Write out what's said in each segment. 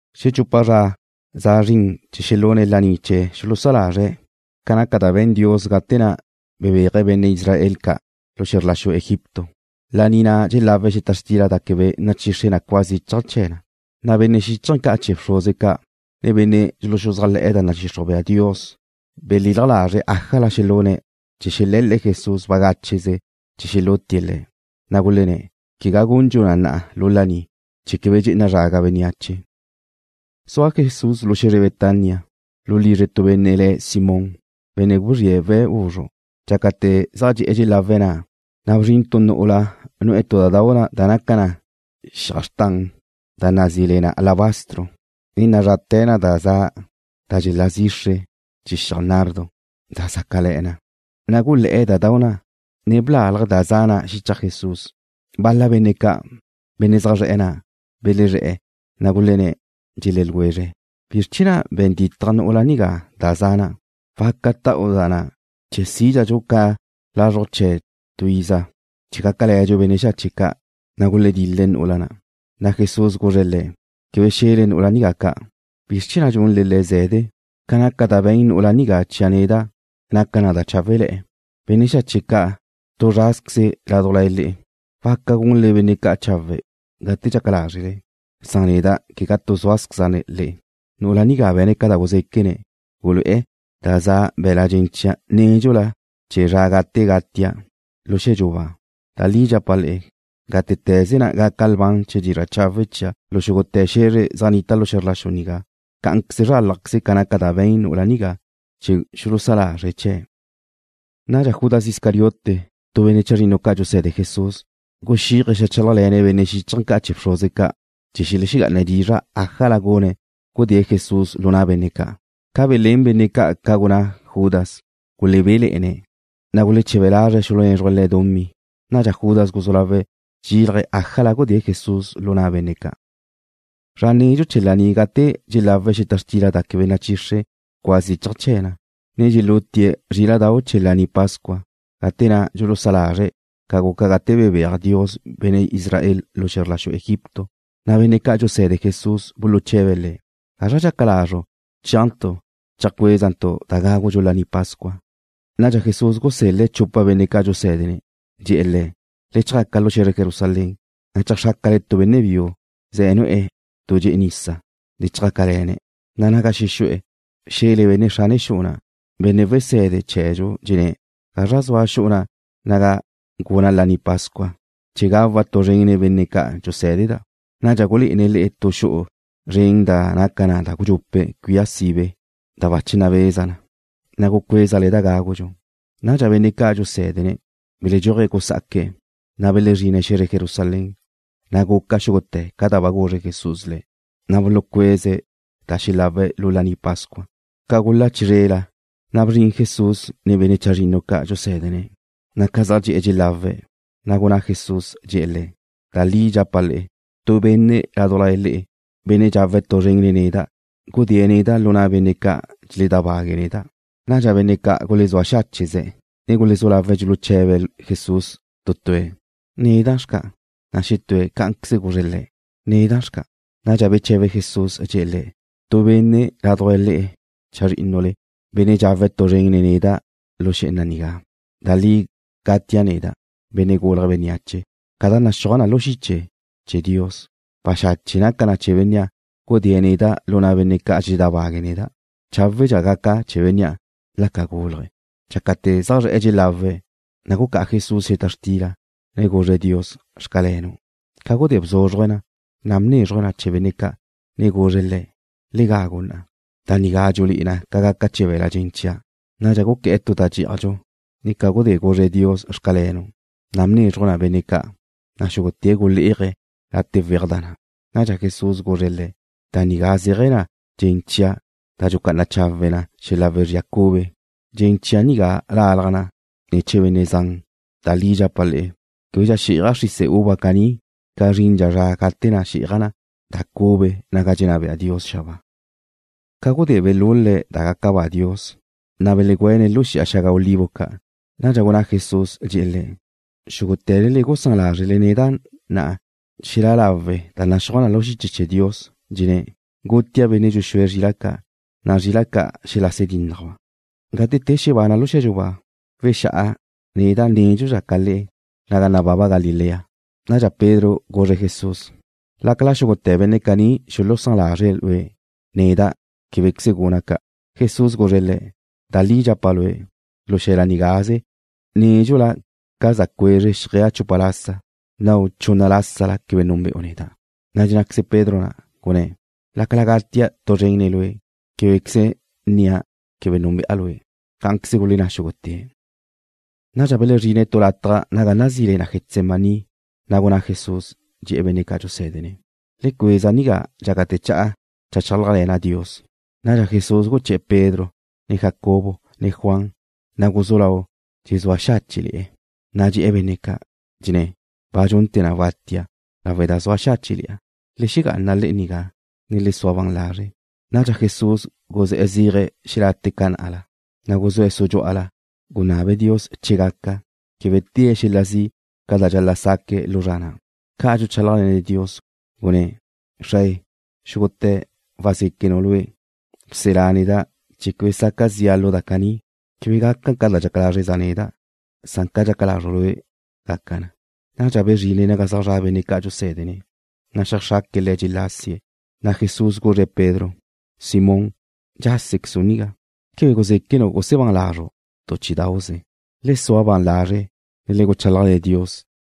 Xechupa zra za zrin chee̱ xelune̱' laní chee̱ xulusá lazre̱' ca naca da be̱n Dios gate na' bebéaje̱' benne' Israel ca' lu xe̱zr la xu Egipto, laní na' dxelawe̱' xeta xtila da quebe nachixre cua zichaj chee̱ na. Na' benne' xíchaje̱ ca' chee̱ bxruze ca', ne benne' dxuluxuzájle̱'e̱ da nadxixruj bea Dios belilaj lazre̱' ájala xelune̱' chee̱ xele̱l-le̱' Jesús bagácheze chee̱ xelútie̱' Le̱'. Na' gulenné̱': ―Quegá gundxu na lu laní, chee̱ quebe dxe'ena zraga bénneache. Zua Jesús lu xe̱zre Betania, lu lizre tu benne' le̱' Simón, benne' guzríe̱' we̱' guzru'. Dxácate̱ zaj dxe'e̱ dxelawe̱' na', na' bzrin tu nu'ula nu'e̱ tu da dau' da naca na xiaj xrtan da nazí le na alabastro, ne nazrate̱ na da za da dxelá zixre chee̱ xiaj nardo, da zácale̱'e̱ na. Na' gulé̱'e̱ da dau' na', ne blálaje̱' da za na' xichaj Jesús. Bal-la benne' ca', benne' zaj zre̱'e̱ na', belezré̱'e̱, na' gulenné̱', dxelé̱ ljwezre̱': ―¿Bizr chee̱ na' be̱n ditaj nu'ula nigá da za na'? Waca ta'u da na' chee̱ sídxadxu ca lázrujdxu chee̱ tu iza, chee̱ gácale̱dxu benne' xache' ca'. Na' guledil-le̱' nu'ula'. Na' Jesús guzre̱' le̱': ―Quebe xe̱le nu'ula nigá ca'. ¿Bizr chee̱ na' dxunle le̱' ze̱de? Ca naca da be̱n nu'ula nigá chia' neda' naca na da cháwele̱'e̱. Benne' xache' ca' tu zrázqueze̱' ládujla le'e. Waca gunle benne' ca' chawe' gate dxaca lázrele, san neda' quegá tu súale̱za' le'e. Nu'ula nigá be̱ne̱' ca da guzéquene̱', gulu'e̱ da za be̱l-la' dxen chia' nédxula chee̱ zra gate gachia' lu xe̱dxu ba. Da li dxapa' le'e, gátete̱ze na' gaca lban chee̱ dizra' chawe' chia' lu xúgute̱ xe̱zre zaj nnita xe̱zr la xu nigá, cá'anqueze zrálajqueze ca naca da be̱n nu'ula nigá, chee̱ xulusá lazre̱' chee̱'. Nadxa Judas Iscariote, tu benne' chazrinnu ca' dxuse̱de Jesús, guxíaje̱' xeajchálajle̱ne̱' benne' xíchaje̱ ca' chee̱ bxruze ca' chee̱ xelexegá'ane̱' dizra' ájala gune̱' gudée̱' Jesús lu na' benne' ca'. Ca belén benne' ca' ca gunná Judas, gulebéle̱'e̱ne̱', na' guleche̱be lazre̱' xulunézruje̱' le̱' dumí. Nadxa Judas guzú lawe̱' dxexílaje̱' ájala gudée̱' Jesús lu na' benne' ca'. Zra nedxu chee̱ laní gate dxelawe̱' xeta xtila da quebe nachixre cua zichaj chee̱ na, ne dxelutie̱' zríla'dau' chee̱ Laní Pascua, gate na' dxulusá lazre̱' ca guca gate bebéaj Dios benne' Israel ca' lu xe̱zr la xu Egipto, na' benne' ca' dxuse̱de Jesús buluche̱be̱' Le̱': ―¿Gazra dxaca lazru' chéajntu' cheajcuézentu' da gágudxu Laní Pascua? Nadxa Jesús gusel-le̱' chupa benne' ca' dxusé̱dene̱'. Dxe̱'e̱ le̱': ―Le chjaca lu xe̱zre Jerusalén, na' cheajxrácale tu benne' biu ze nu'e̱ tu dxe'e nisa. Le chjácale̱ne̱', na' naga xexu'e̱, xe̱le benne' xrane xu'u na': “Benne' Wese̱de chee̱dxu dxenné̱': ¿Gazra zua xu'u naga guna' Laní Pascua, chee̱ gawa' tu zren nen benne' ca' dxusé̱deda'?” Nadxa gulé'ene̱' le'e tu xu'u zren da naca na gudxupe' cuía sibe da bache nabeza na. Na' gucuézale da gágudxu. Nadxa benne' ca' dxusé̱dene̱' belexedxúaje̱' gusá'aque̱', na' belezrine̱' xe̱zre Jerusalén. Na' guca xúgute̱ ca da ba guzre Jesús le̱', na' bulucueze̱' da xelawe̱' lu Laní Pascua. Ca gula chizrela, na' bzrin Jesús nen benne' chazrinnu ca' dxusé̱dene̱'. Na' ca zaj dxe'e̱ dxelawe̱', na' gunná Jesús, dxe̱'e̱ le̱': ―Da li dxapa' le'e, tu benne' ládujla le'e, benne' dxawe̱' tu zren nen neda', gudée̱' neda' lu na' benne' ca' dxeledábague̱' neda'. Nadxa benne' ca' gulezúa xácheze̱', ne gulezú lawe̱' dxuluche̱be̱' Jesús tu tue̱': ―¿Neda' xca'? Na' xetúe̱' cá'anqueze guzre̱' Le̱': ―¿Neda' xca'? Nadxa beche̱be Jesús, dxe̱'e̱ le̱': ―Tu benne' ládujla le'e chazrínnule, benne' dxawe̱' tu zren nen neda' lu xé'ena nigá. Da li gatia' neda', Benne' Gulje̱' Bénneache, ca da naxúaj na chia' lu xiche chee̱ Dios. Baxache' naca chee̱ benne' na' gudée̱' neda' lu na' benne' ca' dxeledábague̱' neda'. Cháwedxa gaca chee̱ bénnea' la ca gúlaje̱'. Dxácate̱ zaj zre̱'e̱ dxelawe̱', na' gucá'a Jesús xeta xtila, ne guzre̱' Dios: “Xcalenu'.” Ca gudé bzúzruje̱' na, na' bnézruje̱' na chee̱ benne' ca', ne guzre̱' le̱': ―Le gagu na. Da nigá dxulé'e na ca gaca chee̱ be̱l-la' dxen chia'. Nadxa guqué̱'e̱ tu da dxé'ajdxu, ne ca gudé guzre̱' Dios: “Xcalenu'”, na' bnézruje̱' na benne' ca', na' xúgute̱' gulé'aje̱' late' weaj da na'. Nadxa Jesús guzre̱' le̱': ―Da nigá zéaje̱ na dxen chia' da dxucá'ana chawe na xel-la wezría cube. Dxen chia' nigá lalaj na ne̱ chee̱ benne' zan. Da li dxapa' le'e, québedxa xí'aja' xrise uva caní ca zrindxa zra gate na' xí'aja' da cube naga dxenná bea Dios xabáa. Ca gudé belul-le̱' da gaca ba Dios, na' belegüene̱' lu Xi'a Xaga Olivo Ca'. Nadxa gunná Jesús, dxe̱'e̱ le̱': ―Xúgute̱le le'e gusán lázrele neda' na'a xe̱la lawe' da naxúaj na lu xiche chee̱ Dios, dxenné̱': “Gutia' benne' dxuxúe̱' zrila' ca', na' zrila' ca' welase dínnajba'.” Gate te xebana' lu xe̱dxu ba, wexá'a neda' nédxula ca le'e naga nababa Galilea. Nadxa Pedro guzre̱' Jesús: ―Láqueze xúgute̱ benne' caní xulusán lazre̱' Lue', neda' québequeze guna' ca'. Jesús guzre̱' le̱': ―Da li dxapa' lue', lu xe̱la nigaze, nédxula ca za cuezre xjeaj chupa lasa, nnau' chunna lasa quebe núnbe'u neda'. Na' dxennáqueze Pedro na', gunné̱': ―Láqueze gatia' tu zren nen Lue', québequeze nnia' quebe núnbe'a Lue'. Cá'anqueze gulenná xúgute̱'. Nadxa belezrine̱' tu lataj naga nazí le na Getsemaní, na' gunná Jesús, dxe̱'e̱ benne' ca' dxusé̱dene̱': ―Le cueza nigá dxácate̱ cha'a cheajchálajle̱na' Dios. Nadxa Jesús guché̱'e̱ Pedro, ne Jacobo, ne Juan, na' guzú lau dxezúa xáche'le̱'e̱. Na' dxe̱'e̱ benne' ca', dxenné̱': ―Ba dxunte̱ na watia' lawe' da zua xáche'le̱'a. Le xegá'ana le'e nigá, ne le sua ban lazre'. Nadxa Jesús guzé̱'e̱ zéaje̱' xelate' ca na'la, na' guzúe̱' sudxú'ala, gunabe̱' Dios che gaca, quebe tée̱' xel-la zi' ca da dxal-la' saque̱' lu zra na'. Ca dxuchálajle̱ne̱' Dios na', gunné̱': ―Xrae, xúgute̱ wazéquenu' Lue'. Bselá neda' chee̱ quebe saca zi'a lu da caní. Quebe gaca ca dxaca lázreza' neda', san ca dxaca lazru' Lue' gaca na. Nadxa bezrine̱' naga zaj zra' benne' ca'an dxusé̱dene̱', ne xeajxraque̱' le̱' dxelásie̱'. Na' Jesús guzre' Pedro: ―Simón, ¿dxásequezu' nigá? ¿Quebe guzéquenu' gusebán lazru' tu chí'idau'ze? Le sua ban lazre', ne le guchálajle̱ Dios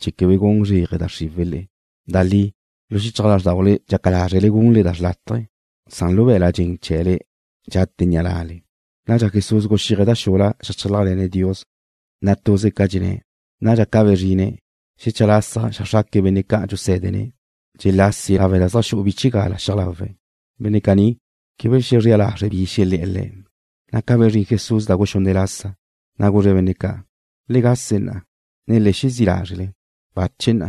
chee̱ quebe gun zréaje da xriwe̱' le'e. Da li, lu xichaj lázrdaule dxaca lázrele gunle da xrlátaje, san lu be̱la' dxen chee̱le dxate ni'a na'le. Nadxa Jesús guxíaje̱' da xula zeajchálajle̱ne̱' Dios, na' tuze ca dxenné̱'. Nadxa ca bezrine̱', xecha lasa xeajxraque̱' benne' ca'an dxusé̱dene̱', dxelásie̱' lawe' da xu'u bchigala xiaj lawe̱'. Benne' caní quebe belexezrela lazre̱' bi xelé̱'e̱ Le̱'. Na' ca bezrín Jesús da guxunne' lasa, na' guzre̱' benne' ca': ―¡Le gase na'a, ne le xezí' lázre'! ¡Bache na!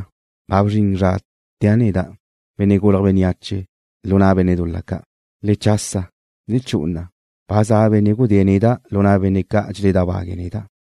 ¡Ba bzrin zra tea' neda', Benne' Gulje̱' Bénneache, lu na' benne' dul-la ca'! ¡Le chasa! ¡Le chu'u na'a! ¡Ba za benne' gudée̱' neda' lu na' benne' ca' dxeledábague̱' neda'!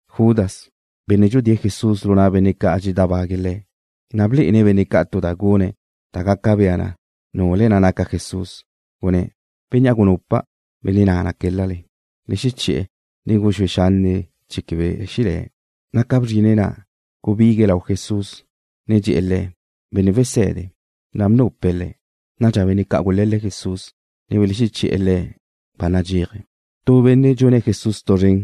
Judas, benne' dxudée̱' Jesús lu na' benne' ca' dxeledábague̱' Le̱', ba blé'ene̱' benne' ca' tu da gune̱' da gaca bea na nule̱' naca Jesús, gunné̱': ―Bénnea' gunupa', benne' na' qué̱l-lale. Le xeché̱'e̱, ne le guxúe xanne' chee̱ quebe xelé̱'. Na' ca bzrine̱' na', gubigue̱' lau Jesús, ne dxe̱'e̱ Le̱': ―Benne' Wese̱de. Na' bnupe̱' Le̱'. Nadxa benne' ca' gule̱l-le̱' Jesús, ne belexeché̱'e̱ Le̱' ba nadxéaje̱'. Tu benne' dxune̱' Jesús tu zren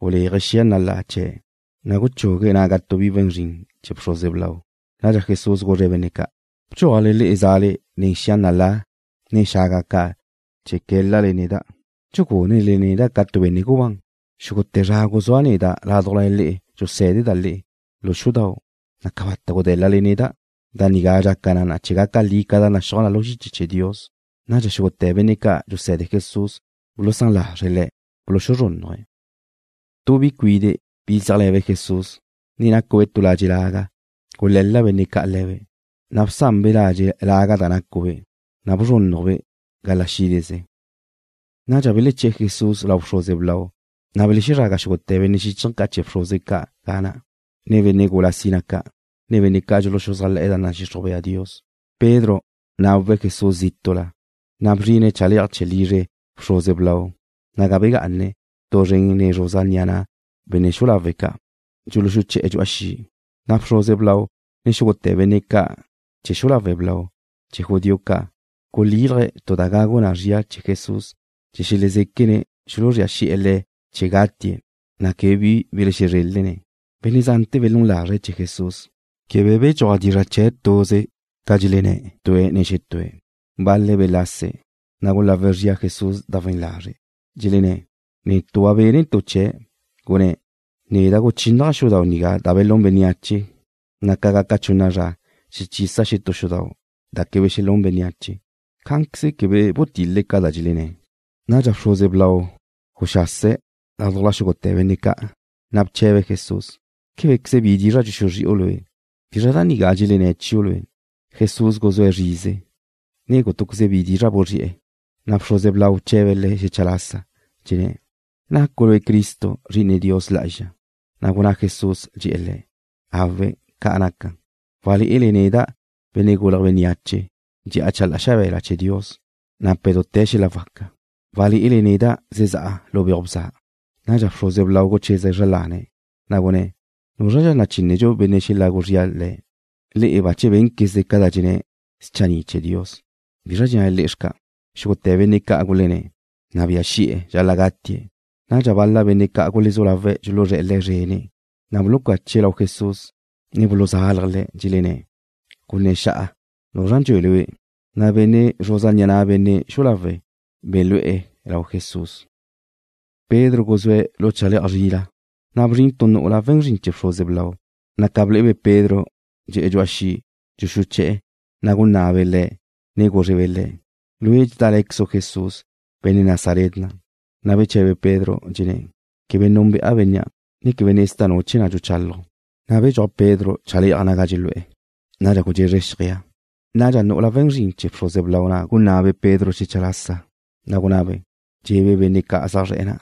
guléaje̱' xia nalá chee̱', na' guchugue̱' naga tu bi we̱n zrin chee̱ bxruze blau. Nadxa Jesús guzre̱' benne' ca': ―¿Bdxuajle le'e zale nen xia nalá, ne xaga ca' chee̱ qué̱l-lale neda', dxugúnele neda' ca tu benne' gubán? Xúgute̱ zra guzúa' neda' ládujla le'e dxusé̱deda' le'e lu xudau', na' cabata' gudé̱l-lale neda'. Da nigá dxaca na chee̱ gaca li ca da naxúaj na lu xiche chee̱ Dios. Nadxa xúgute̱ benne' ca' dxuse̱de Jesús bulusán lazre̱' Le̱'. Buluzrúnnuje̱'. Tu bi cuide', bi zéajle̱be' Jesús, ne nácube' tu ladxe' laga, gule̱l-la benne' ca' le̱be'. Na' bsanbe' ladxe' laga da nácube', na' bzrúnnujbe' gala xídezebe'. Nadxa beleché̱'e̱ Jesús lau bxruze blau, na' belezraga xúgute̱ benne' xíchaje̱ ca' chee̱ bxruze ca' ga na', ne benne' gula sina ca', ne benne' ca' dxuluxuzájle̱'e̱ da nadxixruj bea Dios. Pedro nawe̱' Jesús zítu'la, na' bzrine̱' chale'aj chee̱ lizre bxruze blau, naga begá'ane̱' tu zren nen zruza ni'a na' benne' xu'u lawe' ca', dxuluxuché̱'e̱ dxu'a xi'. Na' bxruze blau, ne xúgute̱ benne' chee̱ xu'u lawe' blau chee̱ judío ca' gulíl-laje̱' tu da gagu na zria Jesús chee̱ xelezéquene̱' xuluzría xi'e̱ Le̱' chee̱ gatie̱', na' quebe bi belezrélene̱'. Benne' zante̱ belún lazre̱' chee̱ Jesús. Quebe bedxúaj dizra' chee̱' tuze ca dxelenné̱' tue̱' ne xetúe̱'. Bal-le̱' belase̱', na' gulagu zría Jesús da we̱n lazre', dxelenné̱': ―Netu' ba bénnentu' chee̱', gunné̱': “Neda' guchínnaja' xudau' nigá da belún bénneache, na' ca gaca chunna zra xechisa' xetú xudau' da quebe xelún bénneache.” Cá'anqueze quebe butil-le ca da dxelenné̱'. Nadxa bxruze blau guxase̱' ládujla xúgute̱ benne' ca', na' bche̱be̱' Jesús: ―¿Québequeze bi dizra' dxuxuzri'u Lue'? ¿Bizra da nigá dxelenné̱' chiu' Lue'? Jesús guzúe̱' zrize, ne gútuqueze bi dizra' buzri'e̱. Na' bxruze blau bche̱be̱' Le̱' xecha lasa, dxenné̱': ―¿Nacu' Lue' Cristo, Zri'ine Dios Lá'azxa? Na' gunná Jesús, dxe̱'e̱ le̱': ―Awe', ca' naca'. Walé'ele neda', Benne' Gulje̱' Bénneache, dxe'a chalá'a xabe̱la chee̱ Dios, nape̱' dute̱ xel-la waca. Walé'ele neda' zezá'a lu beuj bza. Nadxa bxruze blau gucheze̱' zra lane̱', na' gunné̱': ―¿Núzradxa nachínedxu benne' xelagu zria Le̱'? Le'e bache bénquezle ca dxenné̱' schanni' chee̱ Dios. ¿Bi dxennale le'e xca'? Xúgute̱ benne' ca' gulenné̱': ―Nabía xi'e̱ dxal-la gatie̱'. Nadxa bal-la benne' ca' gulezú lawe̱' dxuluzré̱'e̱ Le̱' zrene̱', na' bulucache̱' lau Jesús, ne buluzálaje̱' Le̱'. Dxelenné̱': ―Gunné̱ xa'a nuzra dxue Lue'. Na' benne' zruza ni'a na' benne' xu'u lawe' belú'e̱ lau Jesús. Pedro guzúe̱' lu chale'aj zrila, na' bzrin tu nu'ula we̱n zrin chee̱ bxruze blau, na' ca ble'ebe' Pedro dxe'e̱ dxu'a xi' dxuxuché'e̱, na' gunná'abe' le̱', ne gúzrebe' le̱': ―Lue' dxedále̱quezu' Jesús, benne' Nazaret na'. Na' beche̱be Pedro, dxenné̱': ―Quebe núnbe'a bénnea', ne quebe nezda' nu chee̱ na' dxuchálaju'. Na' bedxúaj Pedro chale'aj naga dxelu'e̱. Nadxa gudxezre xjeaj. Nadxa nu'ula we̱n zrin chee̱ bxruze blau na' gunná'abe' Pedro xecha lasa, na' gunabe', dxe̱'e̱be' benne' ca' zaj zre̱'e̱ na':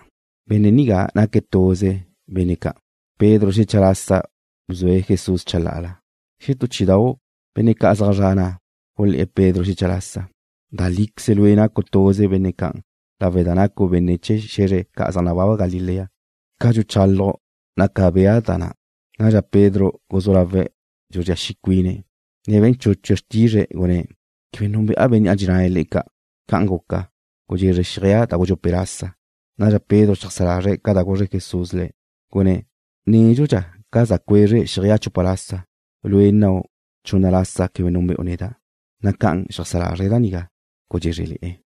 ―Benne' nigá naque̱' tuze benne' ca'an. Pedro xecha lasa bzue̱' Jesús chalá'ala. Xetú chí'idau' benne' ca' zaj zre̱'e̱ na' gulé̱'e̱ Pedro xecha lasa: ―Da líqueze lue' nacu' tuze benne' ca'an lawe' da nacu' benne' chee̱ xe̱zre ca' zaj nababa Galilea. Ca dxuchálaju' naca bea na da na'. Nadxa Pedro guzú lawe̱' dxuzría xi' cuine̱', ne be̱n chúchue̱' xrtizre̱', gunné̱': ―Quebe núnbe'a bénnea' dxennale le'e ca'. Ca'an guca, gudxezre xjeaj da gudxupe' lasa. Nadxa Pedro xeajsá lazre̱' ca da guzre Jesús le̱', gunné̱': “Nédxudxa ca za cuezre xjeaj chupa lasa, lue' nnau' chunna lasa quebe núnbe'u neda'.” Na' ca xeajsá lazre̱' da nigá, gudxézrele̱'e̱.